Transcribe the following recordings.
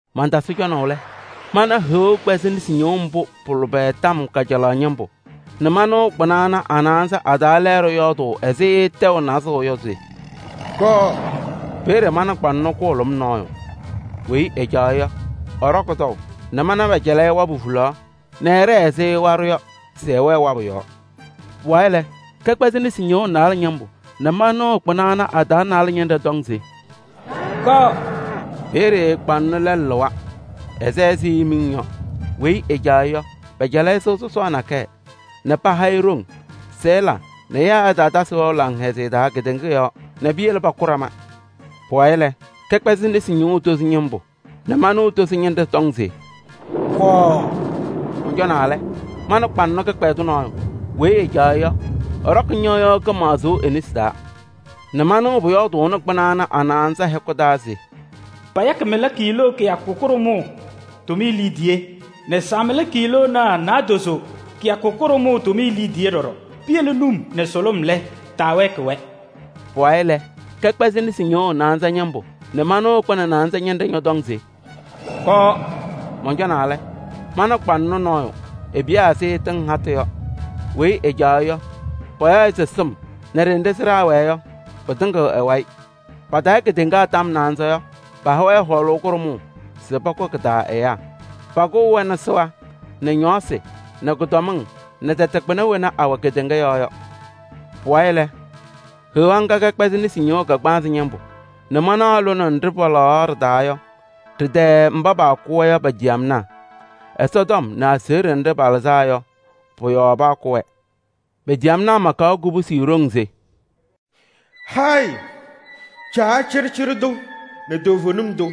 Mantasɩ cɔnaʋ lɛ, mana Heɣa kpɛzɩ nesi ñɩɣʋ mbʋ pʋ-lʋbɛ taa kajalaɣ ñɩmbʋ nɛ manɩɣ kpɩna ana a-naanza a-taa lɛɛɖɛ yɔɔdʋʋ ɛzɩ tɛʋ nazʋʋ yɔ se: “Kɔɔ!” Peeye mana kpaŋnɔ kʋhʋlʋm nɔɔyʋ. Weyi ɛcaɣ-ɩ yɔ, ɛɖɔkɩ tɔʋ nɛ mana pɛcɛlɩ-ɩ wabʋ hulaɣ nɛ ɛɖɛɛ ɛzɩ waɖʋ yɔ se ɛwɛɛ wabʋ yɔɔ. Pʋwayɩ lɛ, kɛkpɛzɩ nesi ñɩɣʋ naalɛ ñɩmbʋ nɛ manɩɣ kpɩna ana a-taa naalɛ ñɩnɖɛ tɔŋ se: “Kɔɔ!” Peeye kpaŋnɔ lɛlʋ lɩwa, ɛsɛ ɛzɩ miŋ yɔ. Weyi ɛcaɣ-ɩ yɔ, pɛcɛlɩ-ɩ sɩɣa sɔsɔɔ nakɛyɛ nɛ paha-ɩ ɖoŋ se ɛla nɛ ɛyaa ɛtaatasɩ wɛʋ laŋhɛzɩyɛ taa kedeŋa yɔɔ nɛ piyele pakʋ ɖama. Pʋwayɩ lɛ, kɛkpɛzɩ nesi ñɩɣʋ tozo ñɩmbʋ nɛ manɩɣ tozo ñɩnɖɛ tɔŋ se: “Kɔɔ!” Mɔncɔnaa lɛ, mana kpaŋnɔ kɩkpɛdʋ nɔɔyʋ. Weyi ɛcaɣ-ɩ yɔ, ɛɖɔkɩ ñɩɣyʋʋ kɩmaɣzʋʋ e-nesi taa nɛ manɩɣ pʋyɔɔdʋʋnɩ kpɩna ana a-naanza a-hɛkʋ taa se: “Payakɩ mɩla kiiloo kɩyakʋ kʋɖʋmʋʋ tʋmɩyɛ liidiye nɛ saamɩla kiiloonaa naadozo kɩyakʋ kʋɖʋmʋʋ tʋmɩyɛ liidiye ɖɔɖɔ. Piyele num nɛ sʋlʋm lɛ, taawɛɛkɩ-wɛ.” Pʋwayɩ lɛ, kɛkpɛzɩ nesi ñɩɣʋ naanza ñɩmbʋ nɛ manɩɣ kpɩnɛ naanza ñɩnɖɛ ñɔtɔŋ se: “Kɔɔ!” Mɔncɔnaa lɛ, mana kpaŋnɔ nɔɔyʋ, epiyaa ɛzɩ tɩŋ hatʋ yɔ. Weyi ɛcaɣ-ɩ yɔ, payaɣ-ɩ se Sɩm nɛ ɖenɖe sɩɖaa wɛɛ yɔ pɩtɩŋɩɣ ɛ-wayɩ. Patayɩ kedeŋa tɔm naanza yɔ, paha-wɛ ɖoŋ kʋɖʋmʋʋ yɔɔ se pakʋ kɩ-taa ɛyaa. Pakʋʋ-wɛ nɛ sɩɣa nɛ ñɔɔsɩ nɛ kʋdɔmɩŋ nɛ tɛtɛ kpɩna wena awɛ kedeŋa yɔɔ yɔ. Pʋwayɩ lɛ, Heɣa ŋga kɛkpɛzɩ nesi ñɩɣʋ kagbaanzɩ ñɩmbʋ nɛ manaɣ lone nɖɩ palaɣ ɖɩ-taa yɔ, ɖɩ-tɛɛ mba paakʋ-wɛ yɔ pa-ciyamnaa. Ɛsɔtɔm nɛ aseɣɖe nɖɩ palɩzaa yɔ, pɔ-yɔɔ paakʋ-wɛ. Pa-ciyamnaa makaɣ kubusi ɖoŋ se: “Hayɩ Caa cɩɖɩcɩɖɩ tʋ nɛ toovenim tʋ!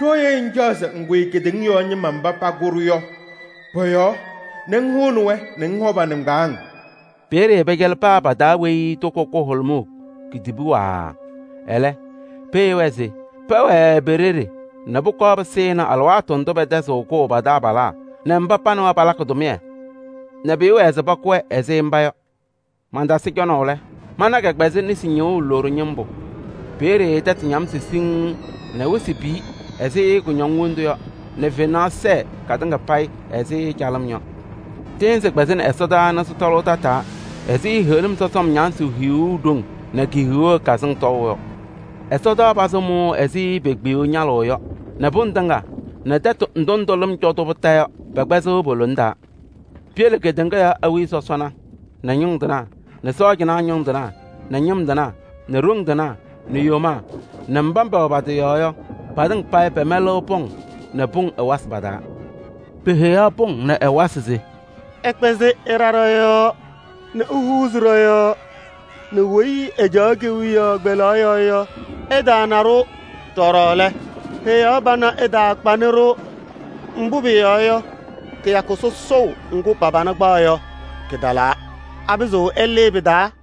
Ɖooye ŋcaɣ se ŋkʋyɩ kedeŋa yɔɔ ñɩma mba pakʋ-ɖʋ yɔ pɔ-yɔɔ nɛ ŋhʋnɩ-wɛ nɛ ŋhɔ pa-nɩŋgbaaŋ?” Peeye pɛcɛlɩ paa pa-taa weyi toko kʋhʋlʋmʋʋ kitibuu waaa. Ɛlɛ, peheyi-wɛ se pɛwɛɛ pe-ɖeɖe nɛ pʋkɔɔ pɩsɩnɩ alɩwaatʋ ndʋ pɛtɛzɩ kʋʋ pa-taabalaa nɛ mba pa nɛ wɛ palakɩ tʋmɩyɛ, nɛ pɩɩwɛɛ se pakʋ-wɛ ɛzɩ mba yɔ. Mantasɩ cɔnaʋ lɛ, mana kɛkpɛzɩ nesi ñɩɣʋ loɖo ñɩmbʋ, peeye tɛtʋ ñamsɩ siŋŋ nɛ wɩsɩ piyi ɛzɩ kʋñɔŋ wondu yɔ nɛ fenaɣ sɛɛ katɩŋa payɩ ɛzɩ calɩm yɔ. Tɩɩnzɩ kpɛzaɣnɩ ɛsɔdaa nɛ sɩtɔlʋʋ tataa ɛzɩ heɣlim sɔsɔm ñamsʋʋ hiyuu ɖoŋ nɛ ki-hiwee kazɩŋ tɔʋ yɔ. Ɛsɔtɔnʋʋ pazɩ mʋʋʋ ɛzɩ pekpiyuu ñalʋʋ yɔ nɛ pʋŋ tɩŋa nɛ tɛtʋ ndʋ ndʋ lɩm cɔ-tʋ kondiko yɔ, pɛkpɛzɩɣ po-lona taa. Piyele kedeŋa yɔɔ awiya sɔsɔna nɛ ñʋŋ tɩnaa nɛ sɔɔjanaa ñʋŋ tɩnaa nɛ ñɩm tɩnaa nɛ ɖoŋ tɩnaa nɛ yomaa nɛ mba pɛwɛ pa-tɩ yɔɔ yɔ, patɩŋa payɩ pɛmɛlɩɣ pɔŋ nɛ pʋŋ ɛwasɩ pa-taa. Peheyaɣ pʋŋ nɛ ɛwasɩ se: “Ɩkpɛzɩ ɩɖa ɖɔ-yɔɔ nɛ ihuuzi ɖɔ-yɔɔ nɛ weyi ɛcaɣ kewiyaɣ kpelaɣ yɔɔ yɔ, ɛtaana-ɖʋ. Ɖɔɖɔ lɛ, Heɣa pana ɛtaakpanɩ-ɖʋ. Mbʋ pʋyɔɔ yɔ, kɩyakʋ sɔsɔʋ ŋgʋ pa-pana kpaɣ yɔ, kɩtalaa. Apɩzɩɣ ɛlɩɩ pɩ-taa?”